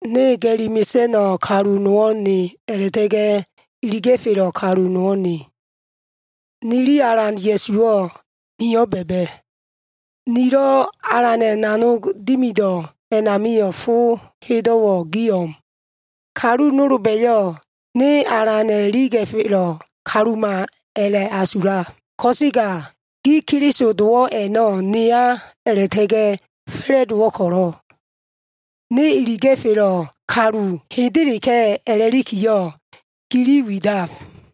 Ne ga꞉li mesa꞉no꞉ kalu nowo꞉ ne, a꞉la꞉ta꞉ga꞉ iliga꞉felo꞉ kalu nowo꞉ ne. Nili Alan Ya꞉suwo꞉ niyo꞉ ba꞉ba꞉. Nilo꞉ Alana꞉ nanog dimido꞉ amilo꞉ fo hedo꞉wo꞉ gi o꞉m. Kalu nolba꞉yo꞉ ne Alana꞉ iliga꞉felo꞉ kaluma a꞉la꞉asulab, ko꞉sega gi Keliso dowo꞉ a꞉no꞉ neya a꞉la꞉ta꞉ga꞉ fa꞉la꞉dowo꞉ ko꞉lo꞉, ne iliga꞉felo꞉ kalu hendeleka꞉ a꞉lakiyo꞉, gili widab.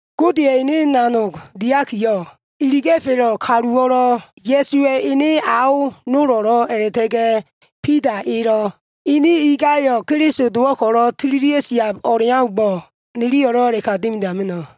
Godeya꞉ ene nanog diakiyo꞉, iliga꞉felo꞉ kaluwo꞉lo꞉, Ya꞉suwa꞉ ene ao nolo꞉lo꞉ a꞉la꞉ta꞉ga꞉ Bida elo꞉, ini ingayo꞉ Keliso dowo꞉ ko꞉lo꞉ tililia꞉ siab o꞉leaumbo꞉, niliyo꞉lo꞉ a꞉la꞉ka dimidama꞉no꞉.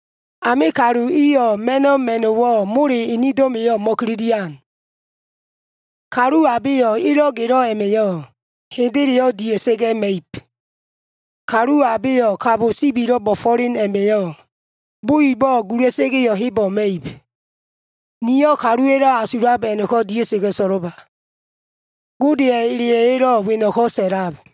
Ame kalu iyo꞉ ma꞉no꞉ ma꞉no꞉wo꞉ mole enedo꞉ma꞉yo꞉ mo꞉kililian. Kalu abeyo꞉ elo꞉ gelo꞉ a꞉ma꞉yo꞉, hendeyo꞉ dia꞉sa꞉ga꞉ ma꞉ib. Kalu abeyo꞉ kabo sibilo꞉ bo꞉fo꞉len a꞉ma꞉yo꞉, bo ibo꞉ gula꞉sa꞉ga꞉yo꞉ hebo꞉ ma꞉ib. Niyo꞉ kaluwa꞉lo꞉ asulab a꞉no꞉ko꞉ dia꞉sa꞉ga꞉ so꞉lo꞉ba. Godeya꞉ eleya꞉yo꞉lo꞉ weno꞉ko꞉ sa꞉lab.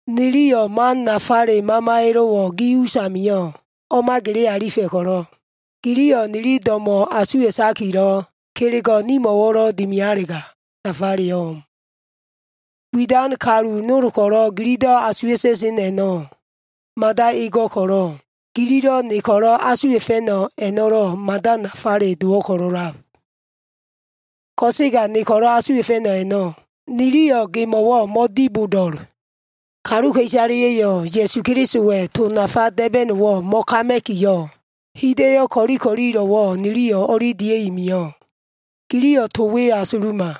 Niliyo꞉ man nafale mamaya꞉lo꞉wo꞉ gi usamio꞉ o꞉ma gele alifa꞉ ko꞉lo꞉, giliyo꞉ nili do꞉mo꞉ asuwa꞉fa꞉no꞉ kelego꞉wo꞉lo꞉ nimo꞉wo꞉ dimialega, nafaleyo꞉ o꞉m. Widan kalu nol ko꞉lo꞉ gililo꞉ asuwa꞉ta꞉sen a꞉no꞉ mada ego꞉ ko꞉lo꞉, gililo꞉ ni ko꞉lo꞉ asuwa꞉fa꞉no꞉ a꞉no꞉lo꞉ mada nafale dowo꞉ ko꞉lo꞉lab. Ko꞉sega ni ko꞉lo꞉ asuwa꞉fa꞉no꞉ a꞉no꞉, niliyo꞉ gimo꞉wo꞉ mo꞉dibodo꞉l. Kaluka꞉isaleya꞉yo꞉ Ya꞉su Kelisowa꞉ to nafa da꞉ba꞉no꞉wo꞉ mo꞉kama꞉kiyo꞉, hida꞉yo꞉ ko꞉li ko꞉lilo꞉wo꞉ niliyo꞉ o꞉li dia꞉i mio꞉. Giliyo꞉ to we asuluma.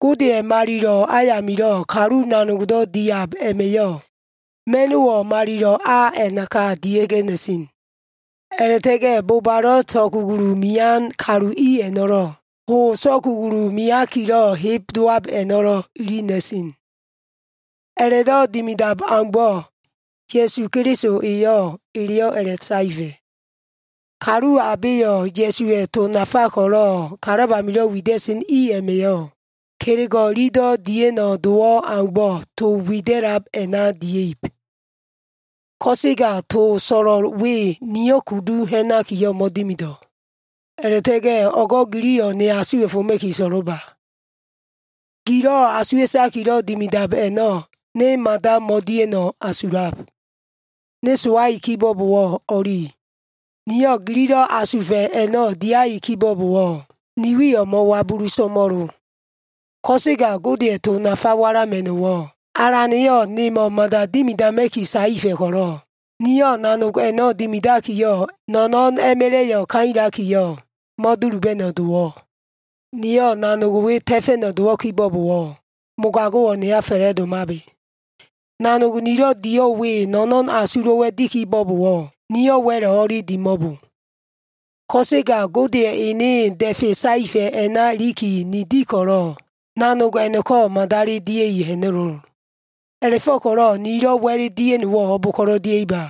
Godeya꞉ malilo꞉ ayamilo꞉ kalu nanogdo꞉ diab a꞉ma꞉yo꞉, ma꞉no꞉wo꞉ malilo꞉ a a꞉naka dia꞉ga꞉ na꞉sen. A꞉la꞉ta꞉ga꞉ bobalo꞉ so꞉kugulu mean kalu i a꞉no꞉lo꞉, ho so꞉kugulu meakilo꞉ heb dowab a꞉no꞉ ili na꞉sen. A꞉la꞉do꞉ dimidan aumbo꞉, Alan Ya꞉su eyo꞉ eleyo꞉ a꞉la꞉saefa꞉. Kalu abeyo꞉ Ya꞉suwa꞉ to nafa ko꞉lo꞉ kalab amilo꞉ wida꞉sen i a꞉ma꞉yo꞉, kelego꞉ ililo꞉ dia꞉no꞉ dowo꞉ aumbo꞉ to wida꞉lab a꞉na dia꞉ib. Ko꞉sega to so꞉lo꞉l we, nio꞉ kudu ha꞉nakiyo꞉ mo꞉dimido꞉. A꞉la꞉ta꞉ga꞉ o꞉go꞉ giliyo꞉ ne asuwa꞉foma꞉ki so꞉lo꞉ba. Gilo꞉ asuwa꞉takilo꞉ dimiab a꞉no꞉ ne mada mo꞉dia꞉no꞉ asulab. Ne sowai kibo꞉bowo꞉ o꞉li. Niyo꞉ gililo꞉ asufa꞉ a꞉no꞉ diai kibo꞉bowo꞉, ni wiyo꞉ mo꞉wabulu so꞉mo꞉lo. Ko꞉sega Godeya꞉ to nafa walama꞉no꞉wo꞉ Alan eyo꞉ nemo꞉ mada dimidama꞉ki saefa꞉ ko꞉lo꞉, niyo꞉ nanog a꞉no꞉ dimidakiyo꞉, no꞉no꞉n a꞉ma꞉la꞉yo꞉ kailakiyo꞉, mo꞉duluba꞉no꞉ dowo꞉. Niyo꞉ nanog we ta꞉fa꞉no꞉ dowo꞉ kibo꞉bowo꞉, mogago꞉wo꞉ neya fa꞉la꞉domabe. Nanog nilo꞉ dio꞉l we no꞉no꞉n asulo꞉wa꞉ di kibo꞉bowo꞉, niyo꞉ wa꞉lo꞉ o꞉li dimo꞉lo. Ko꞉sega Godeya꞉ enedo꞉ da꞉fe saefa꞉ a꞉na ilikiyo꞉ ni di ko꞉lo꞉, nanog a꞉no꞉ko꞉ madali dia꞉i ha꞉na꞉lo꞉l. A꞉la꞉fo꞉ko꞉lo꞉ nilo꞉ wa꞉l dia꞉no꞉wo꞉ o꞉bo꞉ngo꞉ ko꞉lo꞉ dia꞉iba?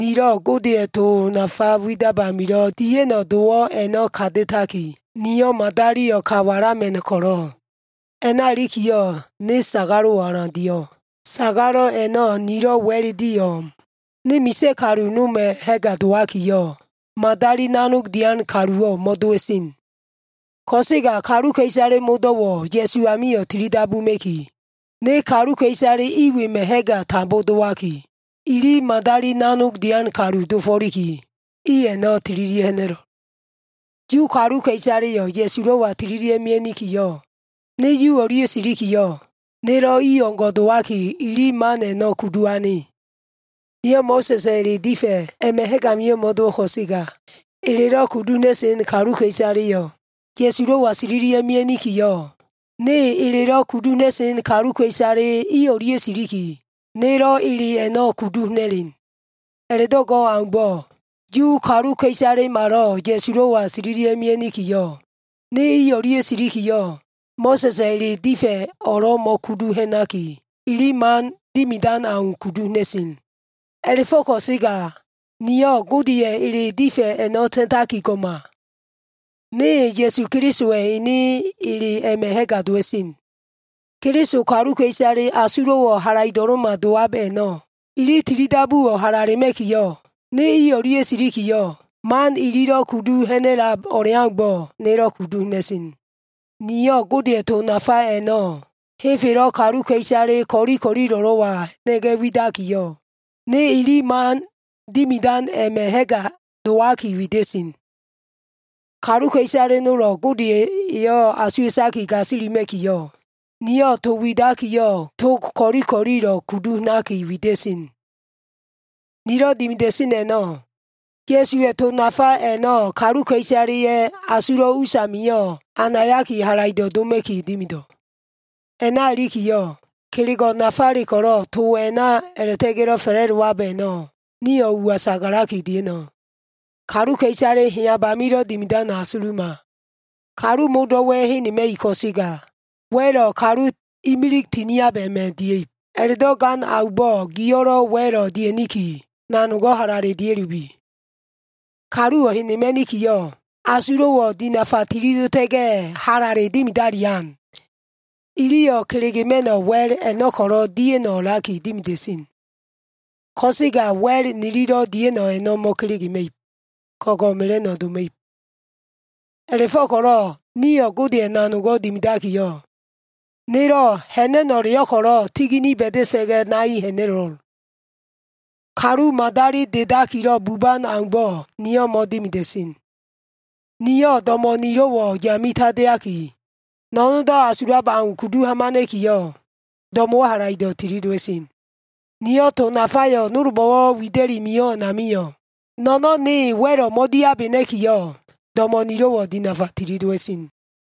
Nilo꞉ Godeya꞉ to nafa widab amilo꞉ dia꞉no꞉ dowo꞉ a꞉no꞉ kata꞉taki, niyo꞉ madaliyo꞉ ka walama꞉no꞉ ko꞉lo꞉, a꞉na ilikiyo꞉ ne sagalo꞉ alan dio꞉l. Sagalo꞉ a꞉no꞉ nilo꞉ wa꞉l dio꞉ o꞉m. Ne misa꞉ kalu noma꞉ ha꞉ga dowakiyo꞉, madali nanog dian kaluwo꞉ mo꞉dowa꞉sen. Ko꞉sega kaluka꞉isale modo꞉wo꞉ Ya꞉su amio꞉ tili dabuma꞉ki, ne kaluka꞉isale i wema꞉ ha꞉ga tambo dowaki, ini madali nanog dian kalu dofo꞉liki, i a꞉no꞉ tililia꞉ ha꞉na꞉lo꞉l. Yu kaluka꞉isaleyo꞉ Ya꞉sulo꞉wa tililia꞉ mia꞉nikiyo꞉, ne Yu o꞉lia꞉ silikiyo꞉, nelo꞉ i o꞉ngo꞉ dowaki, ili man a꞉no꞉ kudu ane. Niyo꞉ Mo꞉sa꞉sa꞉ ele difa꞉ a꞉ma꞉ ha꞉g amio꞉ mo꞉dowo꞉ ko꞉sega, elelo꞉ kudu ha꞉na꞉sen kaluka꞉isaleyo꞉ Ya꞉sulo꞉wa tililia꞉ mia꞉nikiyo꞉, ne elelo꞉ kudu ha꞉na꞉sen kaluka꞉isale i o꞉lia꞉ siliki, nelo꞉ ele a꞉no꞉ kudu ha꞉na꞉len. A꞉la꞉do꞉ go꞉ aumbo꞉, Yu kaluka꞉isalemalo꞉ Ya꞉sulo꞉wa tililia꞉ mia꞉nikiyo꞉, ne i o꞉lia꞉ silikiyo꞉, Mo꞉sa꞉sa꞉ ele difa꞉ o꞉lo꞉ mo꞉kudu ha꞉naki, ili man dimidan au kudu ha꞉na꞉sen. A꞉la꞉fo꞉ ko꞉sega niyo꞉ Godeya꞉ ele difa꞉ a꞉no꞉ ta꞉taki go꞉ma. Ne Ya꞉su Kelisowa꞉ ene ele a꞉ma꞉ ha꞉ga dowa꞉sen. Keliso kaluka꞉isale asulo꞉wo꞉ halaido꞉lo꞉ma dowab a꞉no꞉, ili tilidabuwo꞉ halalema꞉kiyo꞉, ne i o꞉lia꞉ silikiyo꞉, man ililo꞉ kudu ha꞉nab o꞉leaumbo꞉, nelo꞉ kudu ha꞉na꞉sen. Niyo꞉ Godeya꞉ to nafa a꞉no꞉ henfelo꞉ kaluka꞉isale ko꞉li ko꞉lilo꞉wa ha꞉na꞉ga꞉ widakiyo꞉, ne ini man dimidan a꞉ma꞉ ha꞉ga dowaki wida꞉sen. Kaluka꞉isale nolo꞉ Gode eyo꞉ asuwa꞉taki gasilima꞉kiyo꞉, niyo꞉ to widakiyo꞉ tog ko꞉li ko꞉lilo꞉ kudu ha꞉naki wida꞉sen. Nilo꞉ dimida꞉sen a꞉no꞉ Ya꞉suwa꞉ to nafa a꞉no꞉ kaluka꞉isaleya꞉ asulo꞉ usamio꞉ anayaki halaido꞉ doma꞉ki dimido꞉. A꞉na ilikiyo꞉, kelego꞉ nafale ko꞉lo꞉ to a꞉na a꞉la꞉ta꞉ga꞉lo꞉ fa꞉la꞉dowa꞉lab a꞉no꞉ nio꞉ uwa sagalaki dia꞉no꞉. Kaluka꞉isale heyab amilo꞉ dimidano꞉ asuluma. Kaluwo꞉ modo꞉wa꞉ henema꞉ib ko꞉sega, wa꞉lo꞉ kalu imilig tiniab a꞉ma꞉ dia꞉ib. A꞉la꞉do꞉ gan aumbo꞉, gio꞉lo꞉ wa꞉lo꞉ dia꞉niki, nanogo꞉ halale dia꞉lubi. Kaluwo꞉ henema꞉nikiyo꞉, asulo꞉wo꞉ dinafa tili dota꞉ga꞉, halale dimidalian. Iliyo꞉ kelegema꞉no꞉ wa꞉l a꞉no꞉ ko꞉lo꞉ dia꞉no꞉ a꞉laki dimida꞉sen. Ko꞉sega wa꞉l nililo꞉ dia꞉no꞉ a꞉no꞉ mo꞉kelegema꞉ib, ko꞉ngo꞉ mela꞉no꞉ doma꞉ib. A꞉la꞉fo꞉ko꞉lo꞉ niyo꞉ Godeya꞉ nanogo꞉ dimidakiyo꞉, nelo꞉ ha꞉na꞉no꞉leyo꞉ ko꞉lo꞉ tigini ba꞉da꞉ga꞉ nai ha꞉na꞉lo꞉l. Kalu madali dedakilo꞉ buban aumbo꞉ niyo꞉ mo꞉dimida꞉sen. Niyo꞉ do꞉mo꞉ nilo꞉wo꞉ yame tandeaki, no꞉no꞉ndo꞉ asulab au kudu hamana꞉kiyo꞉, do꞉mo꞉wo꞉ halaido꞉ tili dowa꞉sen. Niyo꞉ to nafayo꞉ nolbo꞉lo꞉ wida꞉li mio꞉ a꞉namio꞉ no꞉no꞉n ne wa꞉lo꞉ mo꞉diabena꞉kiyo꞉, do꞉mo꞉ nilo꞉wo꞉ dinafa tili dowa꞉sen.